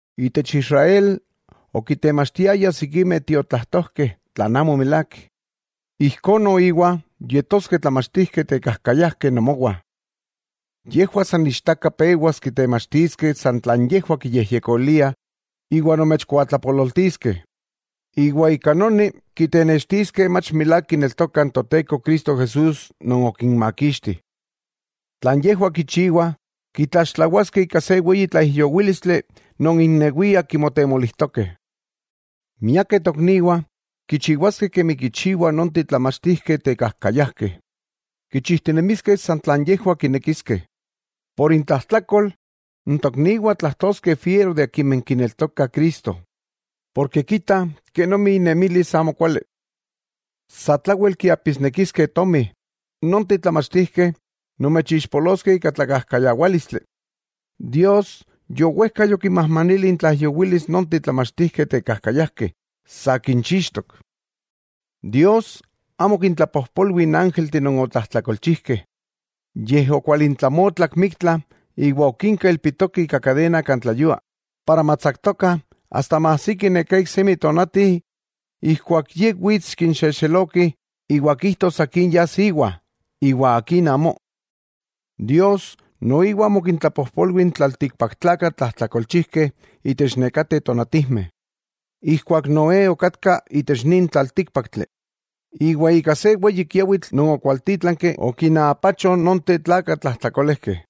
Itech Israel okitemachtiayah sikimeh tiotlajtojkeh tlan amo milák, ijkó noiwa yetoskeh tlamachtijkeh tekajkayajkeh nomowah. Yejwah san ichtaka pewas kitemachtiskeh san tlan yejwah kiyejyekoliah iwa nomechkuatlapololtiskeh, iwa ika noni kitenextiskeh mach milák kineltokah n Toteko Cristo Jesús non okinmakixti; tlan yejwah kichiwah kitlaxtlawaskeh ika se weyi tlaijyowílistli non innewiah kimotemolijtokeh. Miakeh tokniwah kichiwaskeh kemi kichiwah nonteh tlamachtijkeh tekajkayajkeh, kichijtinemiskeh san tlan yejwah kinekiskeh. Por intlajtlakol n tokniwah tlajtoskeh fiero de akimeh kineltokah Cristo, porke kitah kenomi innemilis amokuali. Satlawel kiapisnekiskeh tomi, nonteh tlamachtijkeh nomechixpoloskeh ika tlakajkayawálistli. Dios yowejka yokinmajmanili intlaijyowilis nonteh tlamachtijkeh tekajkayajkeh, sa kinchixtok. Dios amo okintlapojpolwi n ángelteh non otlajtlakolchijkeh, yej okualintlamotlak miktla iwa okinka ilpitokeh ika kadena kan tleyua para matsaktokah asta maajsiki neká iksemi tonati ijkuak Ye wits kinxexeloki iwa kijtos akin yas íwa, iwa akin amó. Dios, noiwa amo okintlapojpolwi n tlaltikpaktlakah tlajtlakolchijkeh itech nekateh tonatijmeh, ijkuak Noé okatka itech nin tlaltíkpaktli, iwa ika se weyi kiawitl non okwaltítlanki okinaapacho nonteh tlakah tlajtlakolejkeh.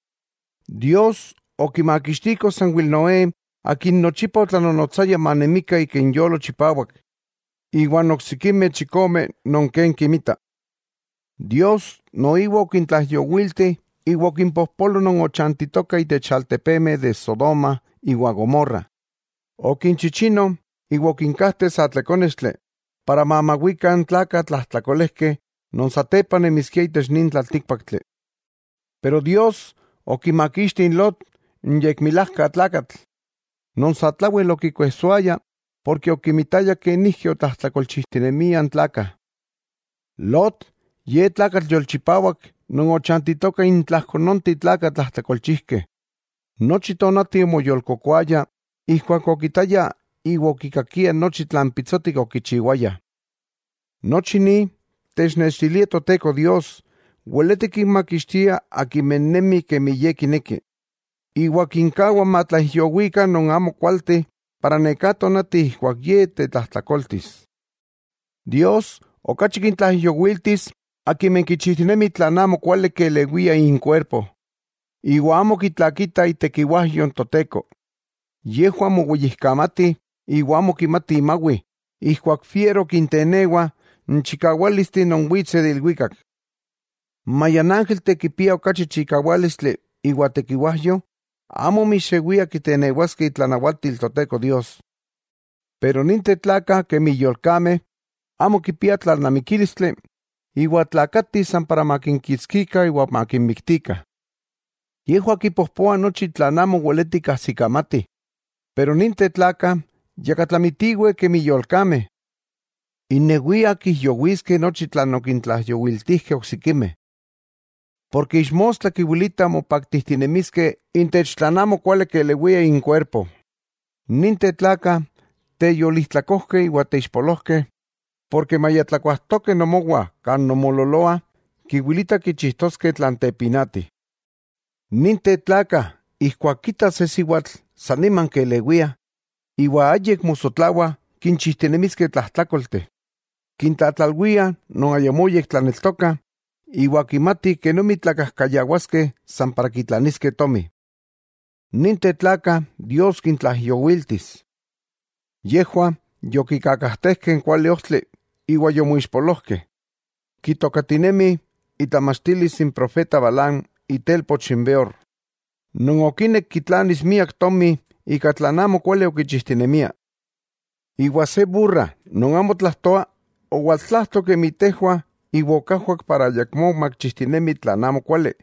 Dios okimakixtiko sanwel Noé akin nochipa otlanonotsaya manemikah ika inyolo chipawak iwan oksikimeh chikome non ken kimitah. Dios noiwa okintlaijyowiltih iwa okimpojpolo non ochantitokah itech altepemeh de Sodoma iwa Gomorra, okinchichino iwa okinkajteh sa tlekónextli, para mamawikah n tlakah tlajtlakolejkeh non satepa nemiskiah itech nin tlaltíkpaktli. Pero Dios okimakixti n Lot, n yekmilaka tlakatl, non satlawel okikuejsoaya, porke okimitaya kenijki otlajtlakolchijtinemiah n tlakah. Lot ye tlakatl yolchipawak non ochantitoka intlajko nonteh tlakah tlajtlakolchijkeh. Nochi tonati omoyolkokoaya ijkuak okitaya iwa okikakia nochi tlan pitsotik okichiwayah. Nochi ni technextilia Toteko Dios weleti kinmakixtia akimeh nemih kemi Ye kineki, iwa kinkawa matlaijyowikah non amokualteh, para neká tonati ijkuak Ye tetlajtlakoltis. Dios okachi kintlaijyowiltis akimeh kichijtinemih tlan amokuali kelewia inkuerpo, iwa amo kitlakitah itekiwajyo n Toteko. Yejwah moweyijkamatih iwa amo kimati mawih ijkuak fiero kintenewa n chikawálisteh non witseh de ilwikak. Maya n ángelteh kipiah okachi chikawálistli iwa tekiwajyo, amo mixewiah kitenewaskeh itlanawatil Toteko Dios. Pero ninteh tlakah kemi yolkameh, amo kipia tlalnamikílistli, iwa tlakatih san para makinkitskikah iwa makinmiktikah. Yejwah kipojpoah nochi tlan amo weletih kajsikamatih, pero ninteh tlakah yakatlamitiweh kemi yolkameh, innewiah kijyowiskeh nochi tlan okintlaijyowiltijkeh oksikimeh. Porke ixmostla kiwilitah mopaktijtinemiskeh intech tlan amo kuali kelewia inkuerpo. ¡Ninteh tlakah teyolijtlakojkeh iwa teixpolojkeh, porke maya tlakuajtokeh nomowah kan nonmoololoah, kiwilita kichijtoskeh tlan tepinati! Ninteh tlakah ijkuak kitah se siwatl san nima kelewiah, iwa ayik mosotlawa kinchijtinemiskeh tlajtlákolteh. Kintlatlalwiah non ayamó yektlaneltokah, iwa kimatih kenomi tlakajkayawaskeh san para kitlaniskeh tomi. Ninteh tlakah Dios kintlaijyowiltis. Yejwah yokikakajtejkeh n kuali ojtli iwa yomoixpolojkeh. Kitokatinemih itlamachtilis n profeta Balaam itelpoch n Beor, non okinek kitlanis miak tomi ika tlan amokuali okichijtinemia. Iwa se burra non amo tlajtoa, owaltlajto kemi tejwah iwa okajwak para ayakmó makichijtinemi tlan amokuali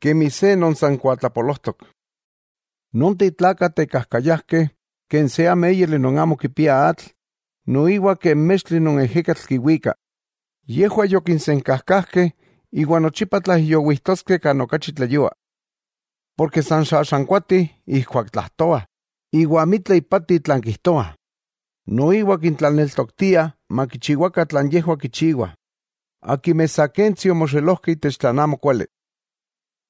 kemi se non san kuatlapolojtok. Nonteh tlakah tekajkayajkeh, ken se améyali non amo kipia atl, noiwa ken mextli non ejekatl kiwika. Yejwah yokinsenkajkajkeh iwa nochipa tlaijyowijtoskeh kan okachi tleyua. Porke san xaxankuatih ijkuak tlajtoah, iwa amitla ipati tlan kijtoah, noiwa kintlaneltoktiah makichiwakah tlan yejwah kichiwah, akimeh sa kentsi omoxelojkeh itech tlan amokuali.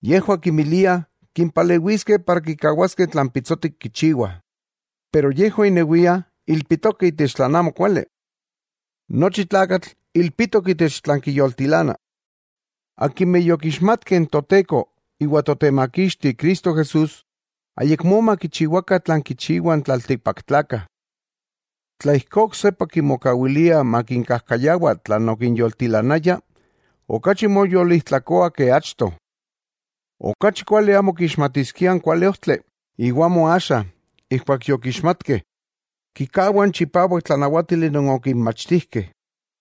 Yejwah kinmiliah kimpalewiskeh para kikawaskeh tlan pitsotik kichiwah, pero yejwah innewiah ilpitokeh itech tlan amokuali. Nochi tlakatl ilpitok itech tlan kiyoltilana. Akimeh yokixmatkeh n Toteko iwa Totemakixti Cristo Jesús, ayakmó makichiwa tlan kichiwah n tlaltikpaktlakah. Tla ijkó oksepa kimokawiliah makinkajkayawa tlan okinyoltilanaya, okachi moyolijtlakoa ke achto. Okachi kuali amo kixmatiskiah n kuali ojtli, iwa amo axa, ijkuak yokixmatkeh, kikawah n chipawak tlanawátili non okinmachtijkeh.